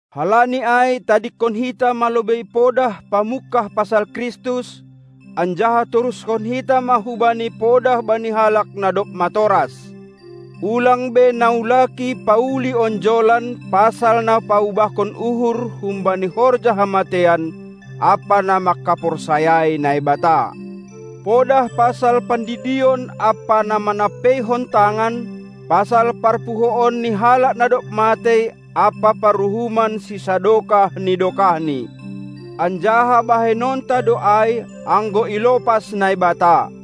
Halani ai tadingkon hita ma lobei podah pamungkah pasal Kristus, anjaha torushon hita ma hubani podah bani halak na dob matoras. Ulang be naulaki pauli onjolan pasal na paubahkon uhur humbani horja hamateian ampa na manghaporsayai Naibata, podah pasal pandidion ampa na manampeihon tangan, pasal parpuhoon ni halak na dob matei ampa paruhuman sisadokah ni dokahni. Anjaha bahenonta do ai, anggo ilopas Naibata.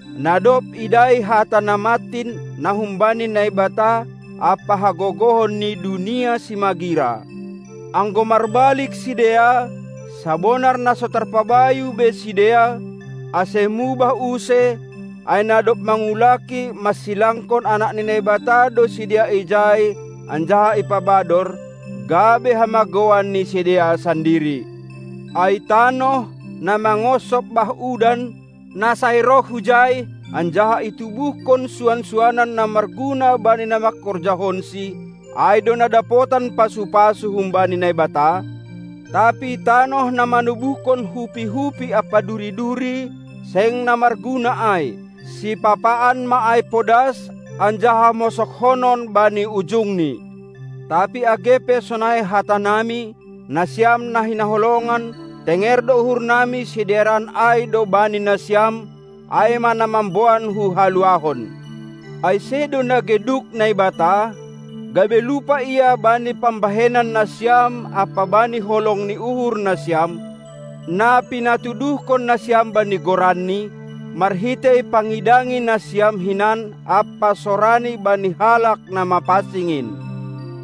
na dob idai hata na mantin na humbani Naibata ampa hagogohon ni dunia simagira, anggo marbalik sidea, sabonar na so tarpabayu be sidea, ase mubah use, ai na dob mangulaki mansilangkon Anak ni Naibata do sidea ijai anjaha ipabador, gabe hamagouan ni sidea sandiri. Ai tanoh, na mangonsop bah udan, na sai roh hujai, anjaha itubuhkon suan-suanan na marguna bani na mangkorjahonsi, ai do na dapotan pasu-pasu humbani Naibata; tapi tanoh na manubuhkon hupi-hupi ampa duri-duri, seng na marguna ai; sipapaan ma ai podas, anjaha mosoghonon bani ujungni. Tapi age pe sonai hatanami, nasiam na hinaholongan, tenger do uhurnami sidearan ai do bani nasiam, ai ma na mamboan hu haluahon. Ai sedo na geduk Naibata, gabe lupa Ia bani pambahenan nasiam ampa bani holong ni uhur nasiam, na pinatuduhkon nasiam bani goranNi, marhitei pangidangi nasiam hinan ampa sorani bani halak na mapansing in.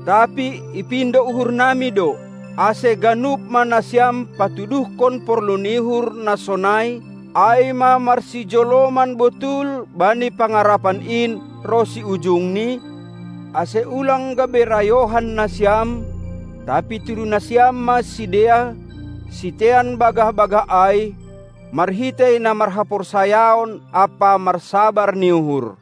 Tapi ipindo uhurnami do, ase ganup ma nasiam patuduhkon porlu ni uhur na sonai, ai ma marsijoloman botul bani pangarapan in ronsi ujungni, ase ulang gabe rayohan nasiam, tapi tiru nasiam ma sidea, sitean bagah-bagah ai, marhitei na marhaporsayaon ampa marsabar ni uhur.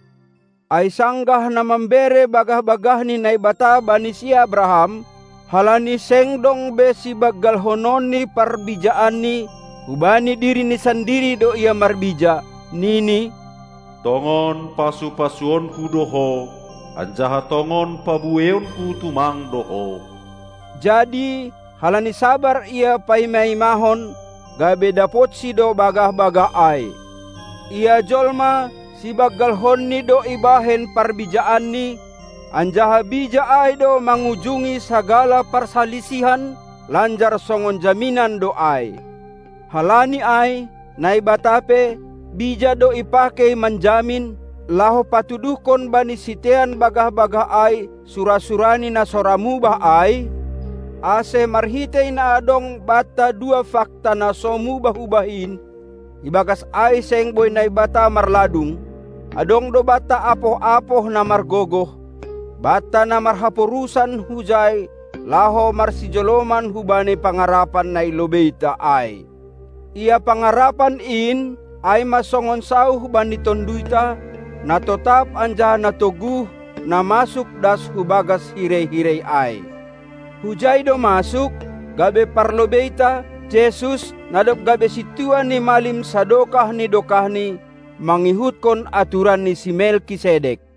Ai sanggah na mambere bagah-bagahni Naibata bani si Abraham, halani seng dong be sibanggalhononni parbijaanni, hubani dirini sandiri do Ia marbija, nini: Tongon pasu-pasuonku do ho, anjaha tongon pabueionku tumang do ho. Jadi, halani sabar ia paima-imahon, gabe dapotsi do bagah-bagah ai. Ia jolma, sibanggalhonni do ibahen parbijaanni, anjaha bija ai do mangujungi sagala parsalisihan lanjar songon jaminan do ai. Halani ai, Naibata pe, bija do ipakei manjamin, laho patuduhkon bani sitean bagah-bagah ai sura-surani na so ra mubah ai, ase marhitei na adong banta dua fakta na so mubah-ubah in, ibagas ai seng boi Naibata marladung, adong do banta apoh-apoh na margogoh, banta na marhaporusan hujai laho marsijoloman hubani pangarapan na i lobeita ai. Ia pangarapan in, ai ma songon sauh bani tonduyta, na totap anjaha na toguh, na masuk das hubagas hirei-hirei ai. Hujai do masuk, gabe parlobeita, Jesus, na dob gabe Sintua ni malim sadokah ni dokahni, mangihutkon aturan ni si Melkisedek.